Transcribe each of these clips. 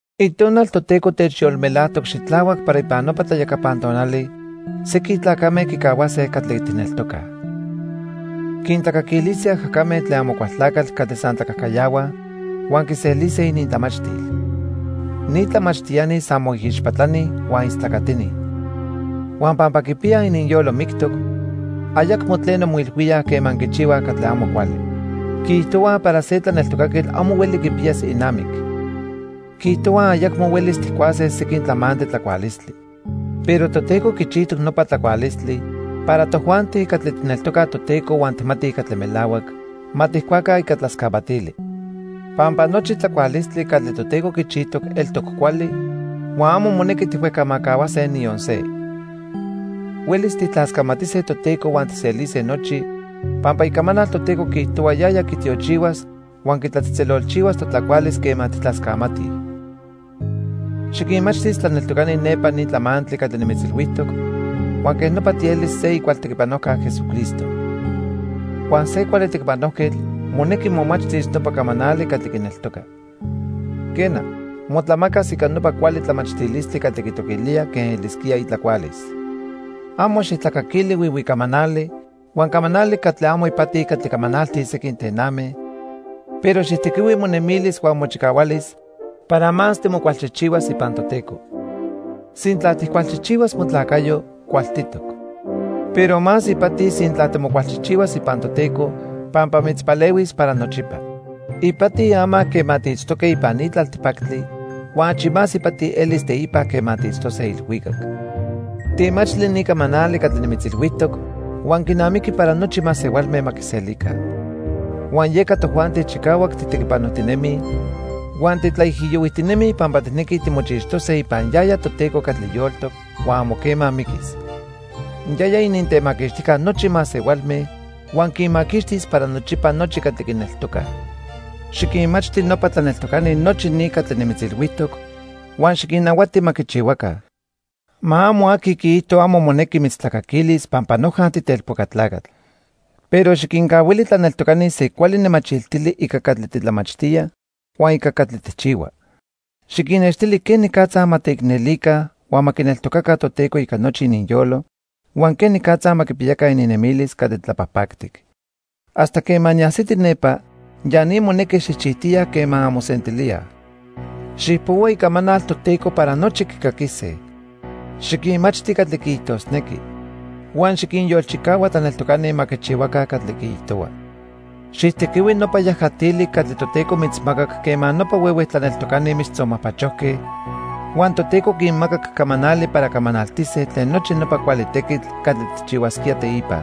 Itonal Toteco techyolmelajtoc xitlahuac para ipan nopa tlayacapan tonali sequin tlacame quicahuase catli tijneltocaj. Quintlacaquilise ajacame tlen Amocualtlacatl catli san tlacajcayahuaj huan quiselise inintlamachtil. Ni tlamachtiani san moijixpatlani huan istlacatini. Huan pampa quipiyaj ininyolo mictoc, ayacmo tleno moilhuíaj quema quichihuaj catli amo cuali. Quiijtohuaj para se tlaneltocaquetl amo hueli quipiyas inamic. Quiijtohuaj ayacmo huelis tijcuase sequin tlamantli tlacualistli. Pero Toteco quichijtoc nopa tlacualistli para tojuanti catli tijneltocaj Toteco huan tijmatij catli melahuac, ma tijcuaca ica tlascamatili. Pampa nochi tlacualistli catli Toteco quichijtoc eltoc cuali huan amo monequi tijhuejcamajcahuase niyon se. Huelis tijtlascamatise Toteco huan tijselise nochi, pampa Icamanal Toteco quiijtohua yaya quitiochihuas huan quitlatzejtzelolchihuas totlacualis quema tijtlascamatij. Xiquinmachtis tlaneltocani nepa ni tlamantli catli nimitzilhuijtoc, huan quej nopa tielis se icual tequipanojca Jesucristo. Huan se cuali tequipanojquetl monequi momachtis nopa camanali catli quineltoca. Quena, motlamacas ica nopa cuali tlamachtilistli catli quitoquilía quen elisquía itlacualis. Amo xijtlacaquili huihui camanali huan camanali catli amo ipati catli camanaltij sequin tename, pero xijtequihui monemilis huan mochicahualis para más timocualchijchihuas ipan Toteco. Sintla tijcualchijchihuas motlacayo, cualtitoc. Pero más ipati sintla timocualchijchihuas ipan Toteco, pampa mitzpalehuis para nochipa. Ipati ama quema tiitztoque ipan ni tlaltipactli huan achi más ipati elis teipa quema tiitztose ilhuicac. Temachtli ni camanali catli nimitzilhuijtoc huan quinamiqui para nochi masehualme ma quiselica. Huan yeca tojuanti chicahuac titequipanojtinemij huan titlaijiyohuijtinemij pampa tijnequij timochixtose ipan yaya Toteco catli yoltoc huan amo quema miquis. Yaya inintemaquixtijca nochi masehualme huan quinmaquixtis para nochipa nochi catli quineltocaj. Xiquinmachti nopa tlaneltocani nochi ni catli nimitzilhuijtoc huan xiquinnahuati ma quichihuaca. Ma amo aqui quiijto amo monequi mitztlacaquilis pampa noja titelpoca tlacatl. Pero xiquincahuili tlaneltocani se cuali nemachiltili ica catli titlamachtía huan ica catli tijchihua. Xiquinnextili quenicatza ma teicnelica huan ma quineltocaca Toteco ica nochi ininyolo huan quenicatza ma quipiyaca ininnemilis catli tlapajpactic. Hasta quema niajsiti nepa, ya ni monequi xijchijtiya quema anmosentilíaj. Xijpohua Icamanal Toteco para nochi quicaquise. Xiquinmachti catli quiijtosnequi. Huan xiquinyolchicahua tlaneltocani ma quichihuaca catli quiijtohua. Xijtequihui nopa yajatili catli Toteco mitzmacac quema nopa huehue tlaneltocani mitztzonmajpachojque huan Toteco quinmacac camanali para camanaltise tlen nochi nopa cuali tequitl catli tijchihuasquía teipa.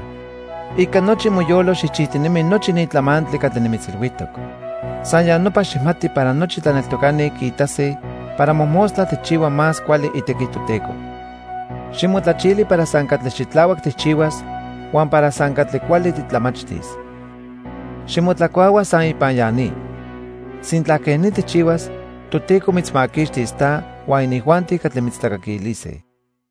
Ica nochi moyolo xijchijtinemi nochi ni tlamantli catli nimitzilhuijtoc. San ya nopa xijmati para nochi tlaneltocani quiitase para mojmostla tijchihua más cuali itequi Toteco. Ximotlachili para san catli xitlahuac tijchihuas huan para san catli cuali titlamachtis. Ximotlacuahua san ipan ya ni. Sintla quej ni tijchihuas, Toteco mitzmaquixtis ta huan inijuanti catli mitztlacaquilise.